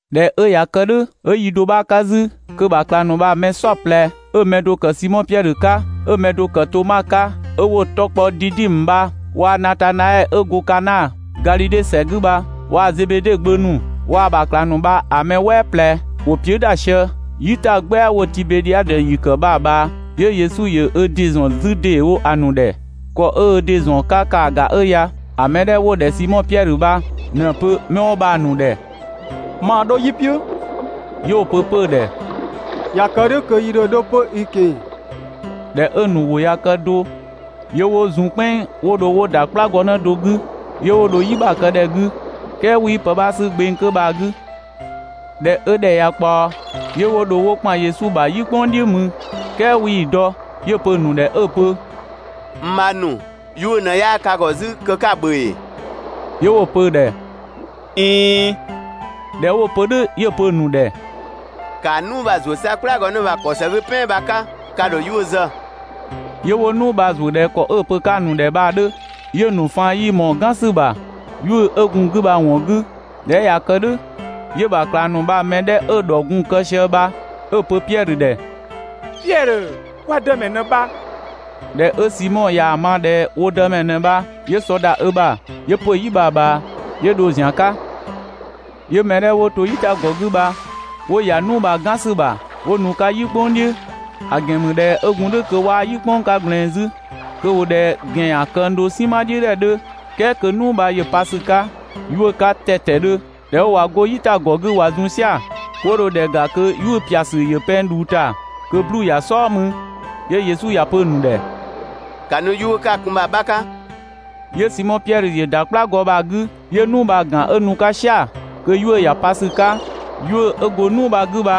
꞊Dhɛ 'ö ꞊ya kë "dhʋ̈ 'ö yi do 'bha 'ka 'zü, kö‑ ‑bha ꞊klang ‑nu bha‑ mɛ "saɔplɛ 'ö‑ mɛ do‑ ‑kë Simɔ Piɛdhö 'ka, 'ö‑ mɛ do‑ ‑kë Toma 'ka 'ö 'wo‑ 'tɔ kpɔ Didimö bha waa‑ Natanaɛɛ 'ö go Kana, Gadhidhe ‑sɛ 'gü bha waa‑ Zebede gbö ‑nu, waa‑ ‑bha ꞊klang ‑nu bha‑ mɛ "wɛɛ ꞊plɛ ‑wo piʋ̈" ‑da sië "yitagbɛa 'wo‑ Tibedhiadö ‑yi ‑kë bha‑ ꞊bhaa, 'yö Yesu ‑yö ö ‑dɩ ‑zɔn 'zü ‑dee wo‑ ‑nu ‑dhɛ. ‑Kɔ 'ö ö ‑dɩ ‑zɔn 'ka ‑kaa ‑ga 'ö ya: ‑A mɛ 'dhɛ 'wo‑ ‑dhɛ Simɔ Piɛdhö bha ꞊në‑ pö 'mɛ 'wo bha‑ ‑nu ‑dhɛ: «Maa 'dho "yi "piʋ̈.» 'Yö 'wo‑ pö 'pö‑ ‑dhɛ: «꞊Ya kë "dhʋ̈ kö yi ‑dho 'dho 'pö i ꞊keng‑.» ꞊Dhɛ 'ö‑ ‑nu ‑wʋ ꞊ya kë do, 'yö 'wo zun "kpɛnng 'wo dho 'wo ‑da "kplagɔnë do 'gü 'yö 'wo dho "yi ‑bha kë ‑dhɛ 'gü, "kɛɛ 'wii pë 'bha 'sü gbeng 'kö bha‑ 'gü. ꞊Dhɛ 'ö ‑dhɛ ꞊ya ꞊kpaɔ, 'yö 'wo dho 'wo ‑kpan Yesu ‑bha "yi "kpʋng "dhiʋ̈ mü, "kɛɛ 'wii‑ dɔ. 'Yö‑ pö‑ ‑nu ‑dhɛ 'ö‑ pö: «N bhang ‑nu, 'yuʋ̈‑ ꞊në 'yaa ka ‑gɔ 'zü kö 'ka‑ ‑bhö ‑ee?» 'Yö wo‑ pö‑ ‑dhɛ: «꞊Iin.» ꞊Dhɛ 'wo‑ pö "dhʋ̈ 'yö‑ pö‑ ‑nu ‑dhɛ: «‑Kaa "nuu bha‑ ‑zuö 'sa "kplagɔnë bha‑ ‑kɔ ‑së 'gü "pɛan bha‑ 'ka, ka ‑dho 'yuʋ̈‑ zë. 'Yö 'wo "nuu bha‑ ‑zuö ꞊dhɛ ‑kɔ 'ö‑ pö 'ka‑ ‑nu ‑dhɛ bha‑ 'dhö, 'yö‑ ‑nu faan 'yii ꞊mɔɔ‑ "gan ‑sü ‑bha 'yuʋ̈‑ 'ö gun‑ 'gü bha‑ ‑wɔn 'gü. ꞊Dhɛ 'ö ꞊ya kë "dhʋ̈, 'yö‑ ‑bha ꞊klang ‑nu bha‑ mɛ 'dhɛ 'ö‑ ‑dhɔ gun‑ kë sië bha 'ö‑ pö Piɛdhö ‑dhɛ: «Piɛdhö, kwa Dëmɛ ꞊në bha!» ꞊Dhɛ 'ö Simɔ ꞊yaa‑ ma ꞊dhɛ wo Dëmɛ ꞊në bha, 'yö sɔ ‑da ö ‑bha, 'yö ‑pö "yi bha‑ ꞊bhaa 'yö dho‑ ‑zian 'ka. 'Yö mɛ 'dhɛ 'wo to "yitagɔ 'gü bha 'wo ‑ya "nuu bha‑ "gan ‑sü ‑bha 'wo nu‑ 'ka "yi "kpʋng "dhiʋ̈, ‑a ‑gɛn ‑mü ꞊dhɛ 'ö gun "dhʋ̈ kö 'waa "yi "kpʋng 'ka ꞊gblɛɛn 'zü, kö ‑wo ꞊dhɛ ‑gɛn ‑yan këng do "sinma "dhiʋ̈ ‑dhɛ 'dhö, "kɛɛ kö "nuu bha ‑yö pa ‑sü 'ka 'yuʋ̈‑ 'ka ‑tɛtɛdhö. ꞊Dhɛ 'ö ꞊wa 'go "yitagɔ 'gü ꞊wa zun "sia‑, 'wo dho ‑dhɛ ‑ga kö 'yuʋ̈‑ ꞊pia ‑sü ‑yö pɛng ꞊dhuu ‑ta kö 'bluu‑ ‑ya "sɔɔ mü. 'Yö Yesu ‑ya pö‑ ‑nu ‑dhɛ: «‑Ka nu 'yuʋ̈‑ 'ka‑ kun bha‑ 'bha 'ka!» 'Yö Simɔ Piɛdhö ‑yö ‑da "kplagɔ bha‑ 'gü 'yö "nuu bha‑ ‑gan 'ö nu‑ 'ka "sia‑, kö 'yuʋ̈‑ ‑ya pa ‑sü 'ka. 'Yuʋ̈‑ 'ö gun "nuu bha‑ 'gü bha‑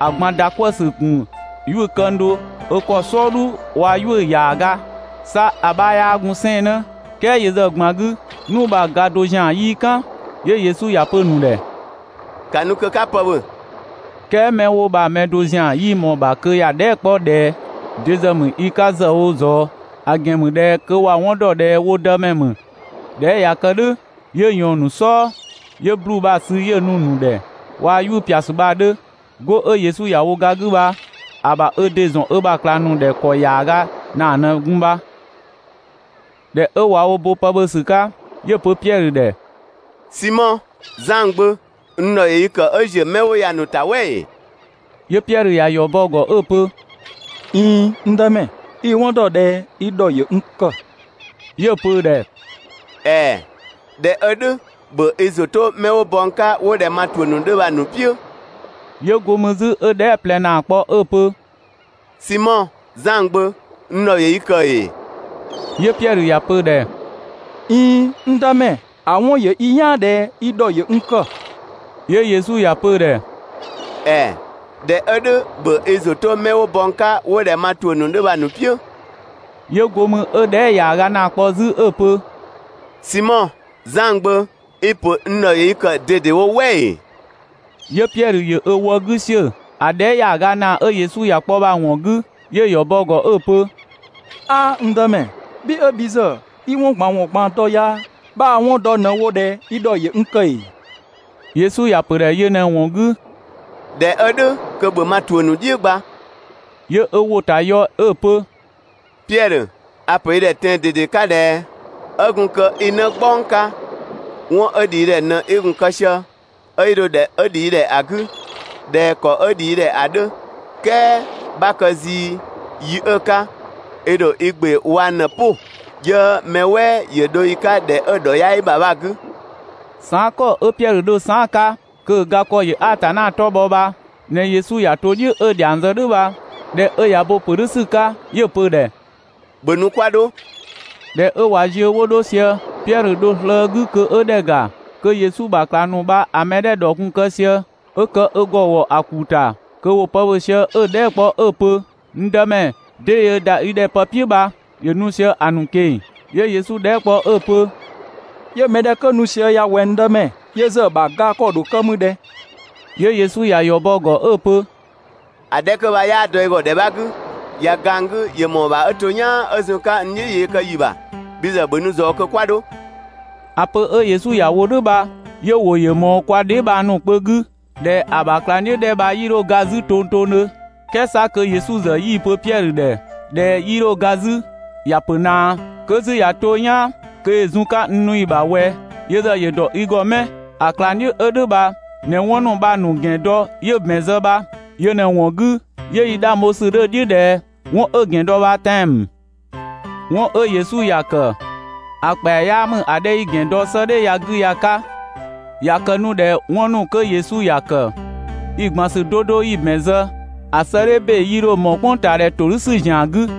꞊gban ‑da 'kwëë‑ ‑sü gun 'yuʋ̈‑ këng do ö ‑kɔ "sɔɔdhu waa‑ 'yuʋ̈‑ ‑yaaga. 'Sa ‑a 'bha 'yaa gun 'sɛɛnnë "kɛɛ yö ‑zë ꞊gban 'gü, "nuu bha‑ ga do ‑zian 'yii "kan. 'Yö Yesu ‑ya pö‑ ‑nu ‑dhɛ: «‑Ka nu kö 'ka pë ‑bhö!» "Kɛɛ 'mɛ 'wo bha‑ mɛ do ‑zian 'yii ꞊mɔɔ‑ ‑bha kö ‑ya dhɛɛ" 'kpɔ ꞊dhɛ: «De ‑zë ‑mü i 'ka ‑zë wo ꞊zɔɔ?» ‑A ‑gɛn ‑mü ꞊dhɛ kö ‑wa 'wɔn ‑dɔ ꞊dhɛ wo Dëmɛ ‑mü. ꞊Dhɛ 'ö ꞊ya kë "dhʋ̈ 'yö ꞊yɔɔn‑ ‑nu "sɔɔ 'yö 'bluu‑ bha‑ sü 'yö‑ nu‑ ‑nu ‑dhɛ waa‑ 'yuʋ̈‑ ꞊pia ‑sü bha‑ 'dhö. 'Go 'ö Yesu ‑ya wo ga 'gü bha‑ ‑bha ö ‑dɩ ‑zɔn ö ‑bha ꞊klang ‑nu ‑dhɛ ‑kɔ ‑yaaga ‑naa ꞊në gun bha. ꞊Dhɛ 'ö ꞊wa wo bo pë ‑bhö ‑sü 'ka, 'yö‑ pö Piɛdhö ‑dhɛ: «Simɔ, Zan gbö, n ‑dhɔ ‑yö i ‑kë 'ö ‑ziö mɛ 'wo ya‑ ‑nu ‑ta "wɛ ‑ee?» 'Yö Piɛdhö ‑ya ‑yɔ bɔ‑ ‑gɔ 'ö‑ pö: «꞊Iin, n Dëmɛ, i‑ 'wɔn ‑dɔ ꞊dhɛ i ‑dhɔ ‑yö n ‑kë.» 'Yö‑ pö‑ ‑dhɛ: «‑Ɛɛ, ꞊dhɛ 'ö "dhʋ̈ ‑bhö i ‑zʋ 'to ('mɛ 'wo bɔ n 'ka 'wo ꞊dhɛ) ma ‑tuʋ̈ ‑nu 'dhö bha‑ ‑nu "piʋ̈!» 'Yö 'go mü 'zü 'ö‑ dhɛɛ" ꞊plɛ ‑naa kpɔ 'ö‑ pö: «Simɔ Zan gbö, n ‑dhɔ ‑yö i ‑kë ‑ee?» 'Yö Piɛdhö ‑ya pö‑ ‑dhɛ: «꞊Iin, n Dëmɛ, ‑a 'wɔn ‑yö i "yaan ꞊dhɛ i ‑dhɔ ‑yö n ‑kë.» 'Yö Yesu ‑ya pö‑ ‑dhɛ: «‑Ɛɛ, ꞊dhɛ 'ö "dhʋ̈ ‑bhö i ‑zʋ 'to ('mɛ 'wo bɔ n 'ka 'wo ꞊dhɛ) ma ‑tuʋ̈ ‑nu 'dhö bha‑ ‑nu "piʋ̈!» 'Yö 'go mü 'ö‑ dhɛɛ" ‑yaaga ‑naa kpɔ 'zü 'ö‑ pö: «Simɔ, Zan gbö, i‑ ‑pö n ‑dhɔ ‑yö i ‑kë ꞊dedewo "wɛ ‑ee?» 'Yö Piɛdhö ‑yö ö wëë 'gü ‑siö ‑a dhɛɛ" ‑yaaga ‑naa 'ö Yesu ‑ya kpɔ bha‑ ‑wɔn 'gü. 'Yö‑ ‑yɔ bɔ‑ ‑gɔ 'ö‑ pö: «'Aa, n Dëmɛ, bhi 'ö bhi ‑zë 'i 'wɔn ꞊gban ‑wɔn ꞊gban dɔ ya, 'bhaa‑ 'wɔn dɔ ꞊në wo ꞊dhɛ i ‑dhɔ ‑yö n ‑kë ‑ee?» Yesu ‑ya ‑pö ‑dhɛ yö ꞊në‑ ‑wɔn 'gü: «꞊Dhɛ 'ö "dhʋ̈ kö ‑bhö ma ‑tuʋ̈ ‑nu "dhiʋ̈ gba!» 'Yö ö ‑wʋ ‑ta ‑yɔ 'ö‑ pö: «Piɛdhö, a‑ ‑pö i ‑dhɛ, tɛan‑ ꞊dede 'ka ꞊dhɛ: 'Ö gun kö i 'në "gbɔng 'ka, 'wɔn 'ö ‑dhi i ‑dhɛ ꞊në 'i gun‑ kë sië, 'ö 'i dho ‑dhɛ 'ö ‑dhi i ‑dhɛ ‑a 'gü ꞊dhɛ ‑kɔ 'ö ‑dhi i ‑dhɛ ‑a 'dhö, "kɛɛ 'bha kë zii yi 'ö‑ 'ka, i ‑dho i ‑gbe wang ꞊në‑ "pʋ, 'yö mɛ "wɛɛ ‑yö dho i 'ka ‑dhɛ 'ö‑ ‑dhɔ 'yaa i ‑bha bha‑ 'gü. Saan" ‑kɔ 'ö Piɛdhö dho saan"‑ 'ka kö‑ ga ‑kɔ ‑yö Atanna 'tɔ bhɔ bha ꞊në Yesu ‑ya to "dhiʋ̈ 'ö‑ dhiang zë "dhʋ̈ bha. ꞊Dhɛ 'ö ꞊ya bo‑ ‑pö "dhʋ̈ ‑sü 'ka 'yö‑ pö‑ ‑dhɛ: «‑Bhö nu 'kwa 'dho.» ꞊Dhɛ 'ö ꞊wa ziö 'wo 'dho sië, Piɛdhö dho slëë‑ ö 'gü kö ‑yö ‑dhɛ ‑ga kö Yesu ‑bha ꞊klang ‑nu bha‑ mɛ 'dhɛ 'ö‑ ‑dhɔ gun‑ kë sië, 'ö kë ö ‑gɔ ‑wɔ ‑a ‑kuu ‑ta kö ‑wo pë ‑bhö sië 'ö‑ dhɛɛ" kpɔ 'ö‑ pö «N Dëmɛ, 'dee yöö ‑da i ‑dhɛ pë "piʋ̈ bha» ‑yö nu sië‑ ‑nu ꞊keng‑. 'Yö Yesu dhɛɛ" kpɔ 'ö‑ pö: «'Yö mɛ 'dhɛ 'kö nu sië ya ꞊wɛ, n Dëmɛ? Yö ‑zë ‑bha ga ‑kɔ ‑dho kë mü ꞊dhɛ?» 'Yö Yesu ‑ya ‑yɔ bɔ‑ ‑gɔ 'ö‑ pö: «‑A 'dhɛ 'kö bha 'yaa dɔ i ‑gɔ ‑dhɛ 'bha 'gü, ꞊ya ga n 'gü, ‑yö ‑mɔɔ ‑bha 'ö to "yaan 'ö zun‑ 'ka n "dhiʋ̈ yee kë ‑yi ‑bha. Bhi ‑zë ‑bhö nu ꞊zɔɔ kö 'kwa 'dho!» ‑A pö 'ö Yesu ‑ya wo "dhʋ̈ bha 'yö‑ ‑wʋ ‑yö ꞊mɔɔ kwa dheebhang ‑nu kpö 'gü ꞊dhɛ ‑a ‑bha ꞊klangdhiʋ̈ 'dhɛ 'kö bha 'yii 'dho ga 'zü tongtongdhö. "Kɛɛ 'sa kö Yesu ‑zë 'yii‑ pö Piɛdhö ‑dhɛ ꞊dhɛ 'yii 'dho ga 'zü, ‑ya ‑pö ꞊naa 'kö 'zü ꞊ya 'to "yaan kö ‑yö zun‑ 'ka n nu yi ‑bha ꞊wɛ, yö ‑zë ‑yö ‑dɔ i ‑gɔ 'mɛ?» ‑A ꞊klangdhiʋ̈ 'ö "dhʋ̈ bha ꞊në 'wɔn ‑nu bha‑ ‑gɛn dɔ 'yö‑ ‑bɛn zë bha. Yö ꞊në‑ ‑wɔn 'gü 'yö 'yi 'dhang bho‑ "dhiʋ̈ ꞊dhɛ 'wɔn 'ö‑ ‑gɛn dɔ bha tɛan‑ ‑mü. 'Wɔn 'ö Yesu ‑ya ‑kë ‑a ‑kpɛa 'yaa ‑mü ‑a 'dhɛ 'yi‑ ‑gɛn dɔ 'sëëdhɛ ya‑ 'gü ya‑ 'ka. ꞊Ya kë 'nu ꞊dhɛ 'wɔn ‑nu 'kö Yesu ‑ya ‑kë yi‑ ꞊gban ‑sü 'do 'do 'yi‑ ‑bɛn zë, ‑a 'sëëdhɛ ‑be 'yii 'dho ꞊mɔɔ "kpʋngtaadhɛ ‑todhʋ̈sü ‑zian 'gü.